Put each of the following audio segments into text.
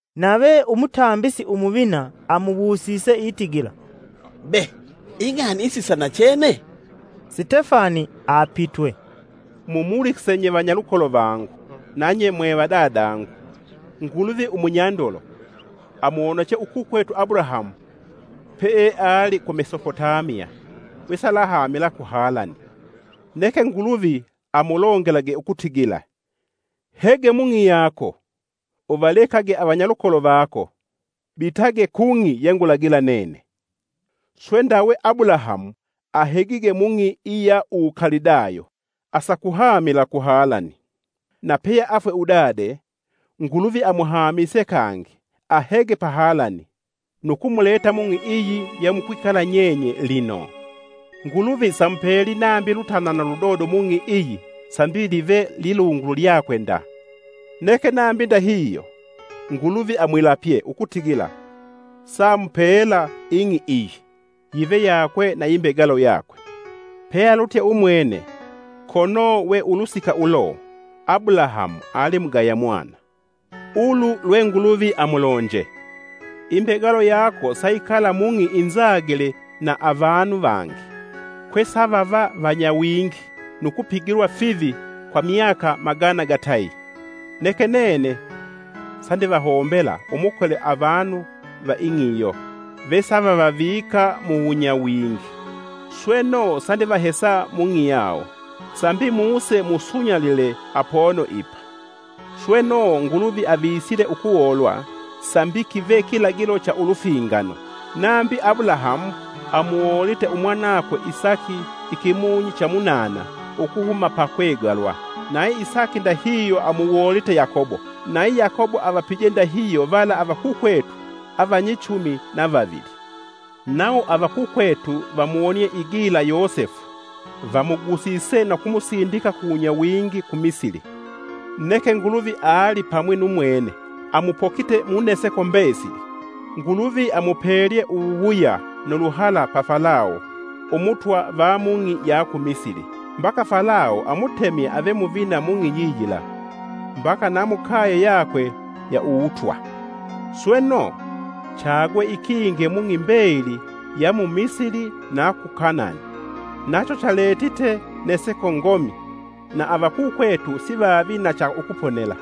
Nave umutambisi Umuvina amuwusise itigila, “Be ing'ani isi sa nachene?” Sitefani apitwe, “mumulikise nye vanyalukolo vangu, nanye mwevadadangu! Nguluvi umunyandolo amuwoneche ukukwetu Abulahamu peeali ku Mesopotamiya wesalahamila ku Halani. Neke Nguluvi amulongelage ukutigila: ‘Hege mung'i yako; uvalekage avanyalukolo vako, bitage kung'i ye ngulagila nene!’ Swe ndawe, Abulahamu ahegige mung'i iya uwukalidayo asakuhamila ku Halani. Na peyeafwe udade, Nguluvi amuhamise kangi ahege pa Halani nu kumuleta mung'i iyi yemukwikala nyenye lino. Nguluvi samupeli nambi lutanana ludodo mung'i iyi sambi live lilungulu lyakwe nda. Neke nambi ndahihyo Nguluvi amwilapye ukutigila saamupela ing'i iyi, yive yakwe na imbegalo yakwe, pealutye umwwene, kono we ulusika ulo Abulahamu ali mugaya mwana. Ulu lwe Nguluvi amulonje: ‘Imbegalo yako sayikala mung'i inzagile na avanu vangi, kwesavava vanyawingi nu kupigilwa fivi kwa myaka magana gatayi. Neke nene sandivahombela umukole avanu va ing'i iyo vesavavavika muwunyawingi. Sweno sandivahesa mung'i yawo, sambi muse musunyalile apono ipa.’ Sweno Nguluvi avisile ukuwoolwa sambi kive kilagilo cha ulufingano. Nambi, Abulahamu amuwoolite umwanakwe Isaki ikimunyi cha munana ukuhuma pakwegalwa. Nayi Isaki ndahihyo, amuwoolite Yakobo. Nayi Yakobo avapije ndahihyo vala avakukwetu avanyichumi na vavili. “Nawo avakukwetu vamuwonie igila Yosefu vamugusise nu kumusindika kuwunyawingi ku Misili. Neke Nguluvi alipamwi nu mwene. Amupokite mu neseko mbesili. Nguluvi amupelye uwuwuya nu luhala pa Falawo umutwa va mung'i ya ku Misili, mbaka Falawo amutemye ave muvina mung'i yiyila, mbaka na mukaye yakwe ya uwutwa. Sweno, chagwe ikinge mung'i mbeyili ya mu Misili na ku Kanani, nacho chaletite neseko ngomi, na avakukwetu sivavi na cha ukuponela.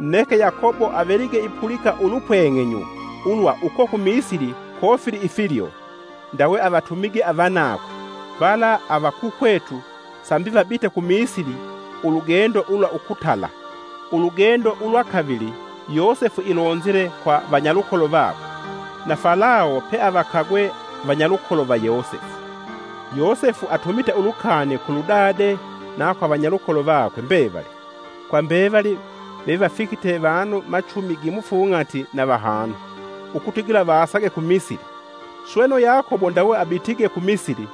Neke Yakobo avelige ipulika ulupweng'enyu ulwa uko ku Misili kofili ifilyo, ndawe avatumige avanakwe vala avakukwetu, sambi vabite ku Misili ulugendo ulwa ukutala. Ulugendo ulwa kavili, Yosefu ilonzile kwa vanyalukolo vakwe, na Falawo peavakagwe vanyalukolo va Yosefu. Yosefu atumite ulukani kuludade na kwa vanyalukolo vakwe mbevali, kwa mbevali vevafikite vanu machumi gimufung'ati na vahanu, ukutigila vasage ku Misili. Sweno, Yakobo ndawe abitige ku Misili,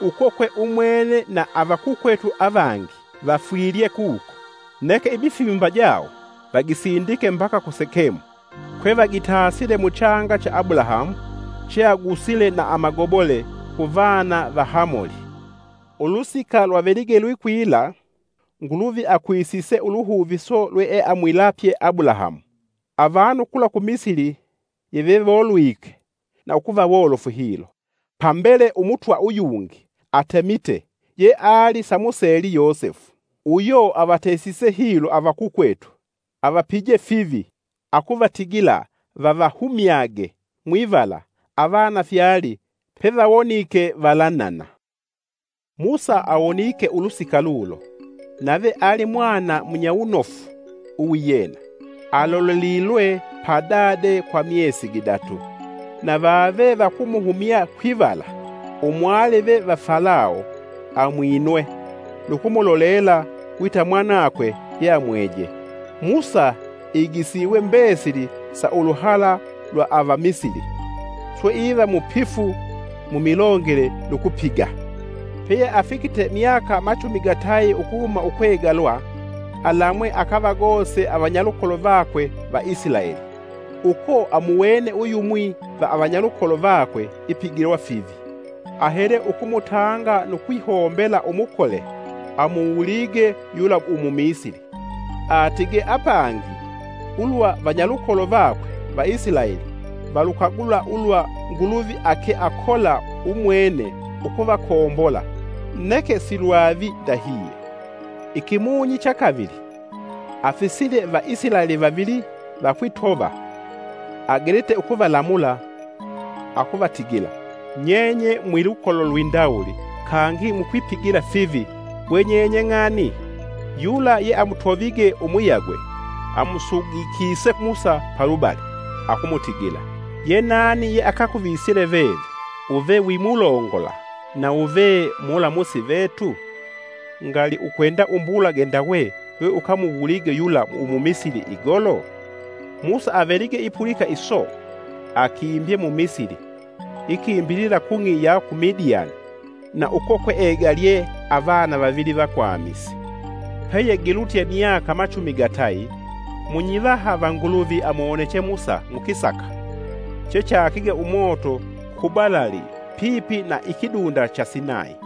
uko kwe umwene na avakukwetu avangi vafwilye kuko. Neke imifimba jawo vagisindike mbaka ku Sekemu, kwe vagitasile muchanga cha Abulahamu cheagusile na amagobole ku vana va Hamoli. “Ulusika lwavelige lwikwila, Nguluvi akwisise uluhuviso lweeamwilapye Abulahamu, avanu kula ku Misili yevewolwike na ukuva wolofu hilo. Pambele Umutwa uyungi atemite yeali samuseli Yosefu. Uyo avatesise hilo avakukwetu avapije fivi, akuvatigila vavahumyage mwivala avana fyali pevawonike valanana. Musa awonike ulusika lulo, nave ali mwana munyawunofu uwiyena. Alolelilwe pa dade kwa myesi gidatu! Na vave vakumuhumya kwivala, Umwalive va Falawo amwinwe, nukumulolela wita mwanakwe yeamweje. Musa igisiwe mbesili sa uluhala lwa ava Misili, swe iva mupifu mu milongele nu kupiga. “Peyeafikite myaka machumi gatayi ukuhuma ukwegalwa alamwe akavagose avanyalukolo vakwe va Isilaeli. Uko amuwene uyumwi va avanyalukolo vakwe ipigilwa fivi, ahele ukumutanga nu kwihombela umukole amuwulige yula umumisili. ( Atige apangi ulwa vanyalukolo vakwe va Isilaeli valukagula ulwa Nguluvi ake akola umwene ukuvakombola, neke silwavi ndahihyo.) Ikimunyi cha kavili, afisile va Isilaeli vavili vakwitova agelite ukuvalamula akuvatigila, ‘Nyenye mwilukolo lwi ndawuli kangi mukwipigila fivi we nyenye ng'ani?’ Yula yeamutovige umuyagwe amusugikise Musa palubali akumutigila: ‘Ye nani yeakakuvisile veve uve wimulongola na ve mulamusi vetu? Ngali ukwenda umbulage ndawe lweukamuwulige yula Umumisili igolo?’ Musa avelige ipulika iso, akimbye mu Misili ikimbilila kung'i ya ku Midiyani na uko kweegalye avana vavili vakwamisi. “Peyegilutye myaka machumi gatayi, munyivaha va Nguluvi amuwoneche Musa mukisaka chechakige umoto ku balali pipi na ikidunda cha Sinayi.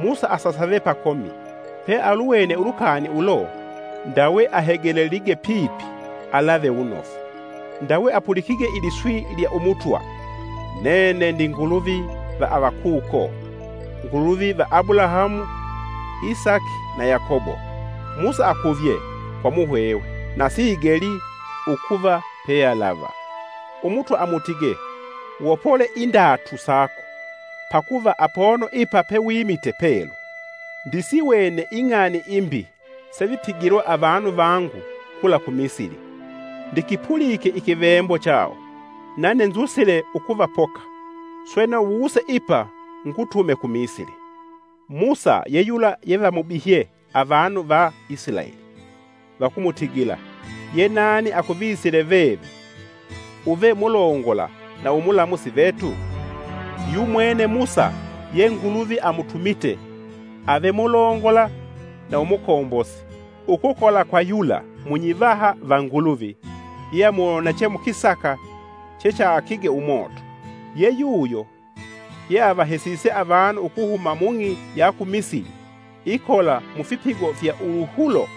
Musa asasave pakomi, pealuwene ulukani ulo, ndawe ahegelelige pipi alave wunofu; ndawe apulikige iliswi lya Umutwa. ‘Nene ndi Nguluvi va avakuko, Nguluvi va Abulahamu, Isaki na Yakobo!’ Musa akuvye kwa muhwehwe na siigelii ukuva pealava. Umutwa amutige, ‘Wopole indatu sako pakuva apono ipa pewimite pelu. Ndisiwene ing'ani imbi sevipigilwa avanu vangu kula ku Misili. Ndikipulike ikivembo chawo, nane nzusile ukuvapoka. Sweno wuse ipa ngutume ku Misili.’ “Musa ye yula yevamubihye avanu va Isilaeli. Vakumutigila, ‘Yenani akuvisile veve uve mulongola na umulamusi vetu?’ Yumwene Musa ye Nguluvi amutumite ave mulongola na umukombosi, ukukola kwa yula munyivaha va Nguluvi, yeamuwoneche mukisaka chechakige umoto. Ye yuyo yeavahesise avanu ukuhuma mung'i ya ku Misili, ikola mufipigo fya uwuhulo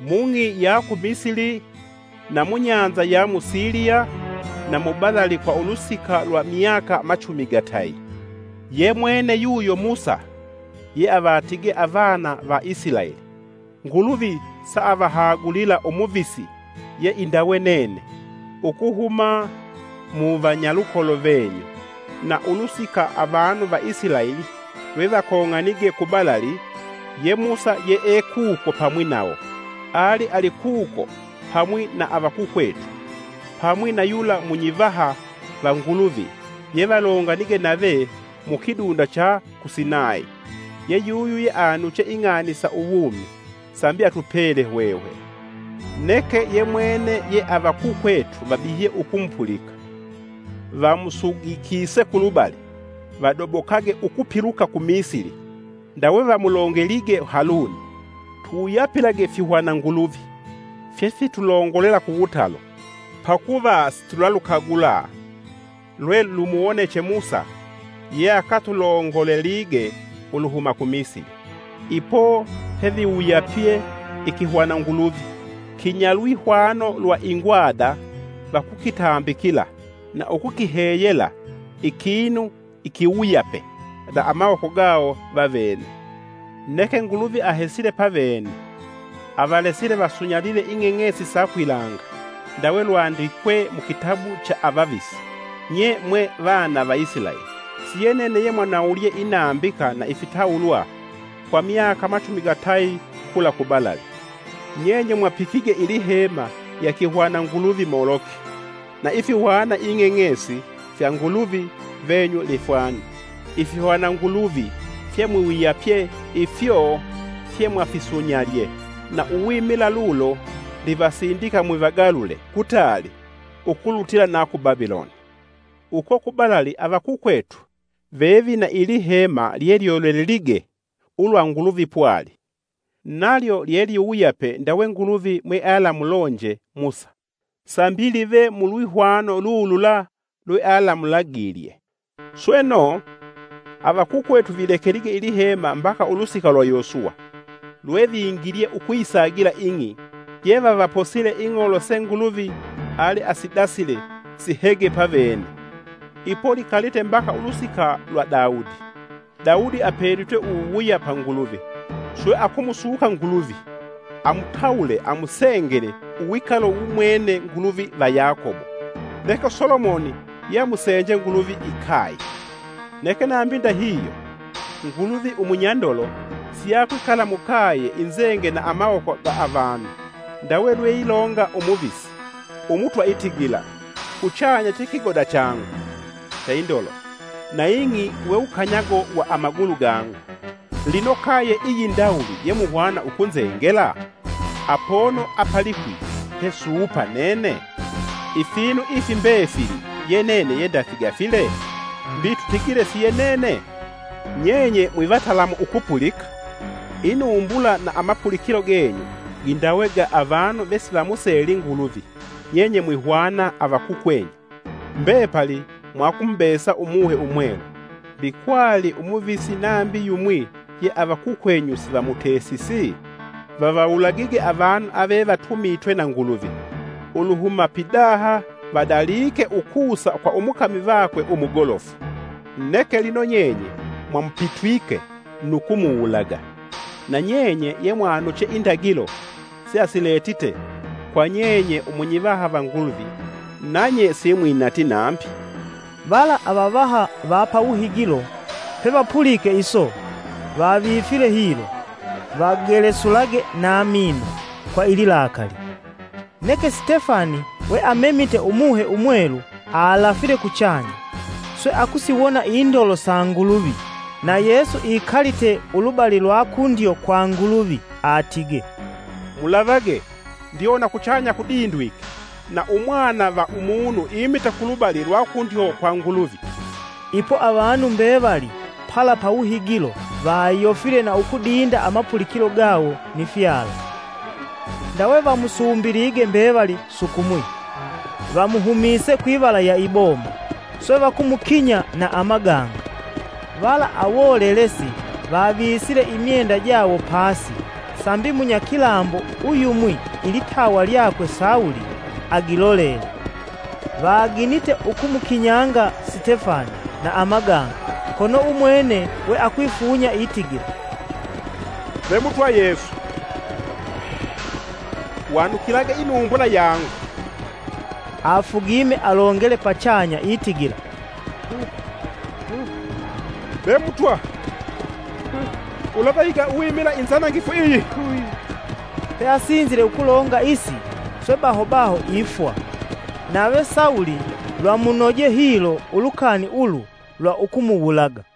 mung'i ya ku Misili na mu Bahali ya mu Shamu na mubalali kwa ulusika lwa myaka machumi gatayi. Ye mwene yuyo Musa yeavatige avana va Isilaeli, ‘Nguluvi saavahagulila Umuvisi ye indawe nene ukuhuma muvanyalukolo venyu.’ Na ulusika avanu va Isilaeli lwevakong'anige ku balali, ye Musa yeekuko pamwi nawo. Ali alikuko pamwi na avakukwetu, pamwi na yula munyivaha va Nguluvi yevalonganige nave mu kidunda cha ku Sinayi, yeyuyu yeanuche ing'ani sa uwumi, sambi atupele hwehwe. “Neke ye mwene ye avakukwetu vabihye ukumupulika, vamusugikise kulubali, vadobokage ukupiluka ku Misili. Ndawe vamulongelige Haluni: ‘Tuwuyapilage fihwana nguluvi fyefitulongolela kuwutalo, pakuva situlalukagula lwe lumuwoneche Musa yeakatulongolelige uluhuma ku Misili!’ Ipo peviwuyapye ikihwananguluvi kinyalwihwano lwa ingwada vakukitambikila na ukukiheyela ikinu ikiwuyape na amawoko gawo vavene. Neke Nguluvi ahesile pavene, avalesile vasunyalile ing'eng'esi sa kwilanga, ndawe lwandikwe mu kitabu cha avavisi, ‘Nye mwe vana va Isilaeli! siye nene yemwanawulye inambika na ifitawulwa kwa myaka machumi gatayi kula ku balali! Nyenye mwapikige ilihema lya kihwana nguluvi Moloki, na ifihwana ing'eng'esi fya nguluvi venyu Lefwani. Ifihwana nguluvi fyemwiwuyapye ifyo fyemwafisunyalye. Na uwimila lulo ndivasindika mwivagalule kutali ukulutila na ku Babiloni!’ Uko ku balali avakukwetu vevina ilihema lyelyolelelige ulwa Nguluvi pwali. Nalyo lyeliwuyape ndawe Nguluvi mwealamulonje Musa, sambi live mu lwihwano lulula lwealamulagilye. Sweno, avakukwetu vilekelige ilihema mbaka ulusika lwa Yosuwa, lwevingilye ukuyisagila ing'i yevavaposile ing'olo se Nguluvi aliasidasile sihege pavene. Ipo likalite mbaka ulusika lwa Daudi. Daudi apelitwe uwuwuya pa Nguluvi, swe akumusuka Nguluvi amutawule amusengele uwikalo wumwene Nguluvi va Yakobo. Neke Solomoni yeamusenje Nguluvi ikaye. “Neke nambi ndahihyo, Nguluvi Umunyandolo siakwikala mukaye inzenge na amawoko ga avanu, ndawe lweilonga umuvisi: ‘Umutwa itigila: Kuchanya chekigoda changu cha indolo, na ing'i wewukanyago wa amagulu gangu. Lino kaye iyindawuli yemuhwana ukunzengela? Apono apalikwi pe suupa nene? Ifinu ifi mbefili ye nene yendafigafile? Mbi tutigile siyenene?’ “Nyenye mwivatalamu ukupulika! Inumbula na amapulikilo genyu gindawe ga avanu vesivamuseli Nguluvi (avamyanza) nyenye mwihwana avakukwenyu. Mbepali mwakumubesa Umuhe Umwelu. Mbi kwali umuvisi nambi yumwi ye avakukwenyu sivamutesisi? Vavawulagige avanu avevatumitwe na Nguluvi, uluhuma pidaha vadalike ukusa kwa umukami vakwe umugolofu. Neke lino nyenye mwamupitwike nu kumuwulaga. Na nyenye ye mwanuche indagilo seasiletite kwa nyenye umunyivaha, va Nguluvi, nanye simwinati nambi.” Vala avavaha va pawuhigilo pevapulike iso, vavifile hilo, vagelesulage na mino kwa ililakali. Neke Sitefani we amemite Umuhe Umwelu, alafile kuchanya swe akusiwona indolo sa Nguluvi na Yesu ikalite ulubali lwa kundyo kwa Nguluvi. Atige, “Mulavage! Ndiwona kuchanya kudindwike na Umwana va Umunu imite kulubali lwa kundyo kwa Nguluvi.” Ipo, avanu mbevali pala pawuhigilo vayofile na ukudinda amapulikilo gawo ni fyala. Ndawe vamusumbilige mbevali sukumwi, vamuhumise kwivala ya iboma, swe vakumukinya na amaganga. Vala awolelesi, vavisile imyenda jawo pasi sambi munyakilambo uyumwi ilitawa lyakwe Sawulo agilolele. Vaginite ukumukinyanga Sitefani na amaganga, kono umwene we akwifunya itigila, “Ve mutwa Yesu, wanukilage inumbula yangu!” Afugime alongele pachanya itigila, “Be Mutwa, ulavahiga uwimila inzangifu iyi.” Peasinzile ukulonga isi, swe baho baho ifwa. Nave Sawulo lwamunoje hilo ulukani ulu lwa ukumuwulaga.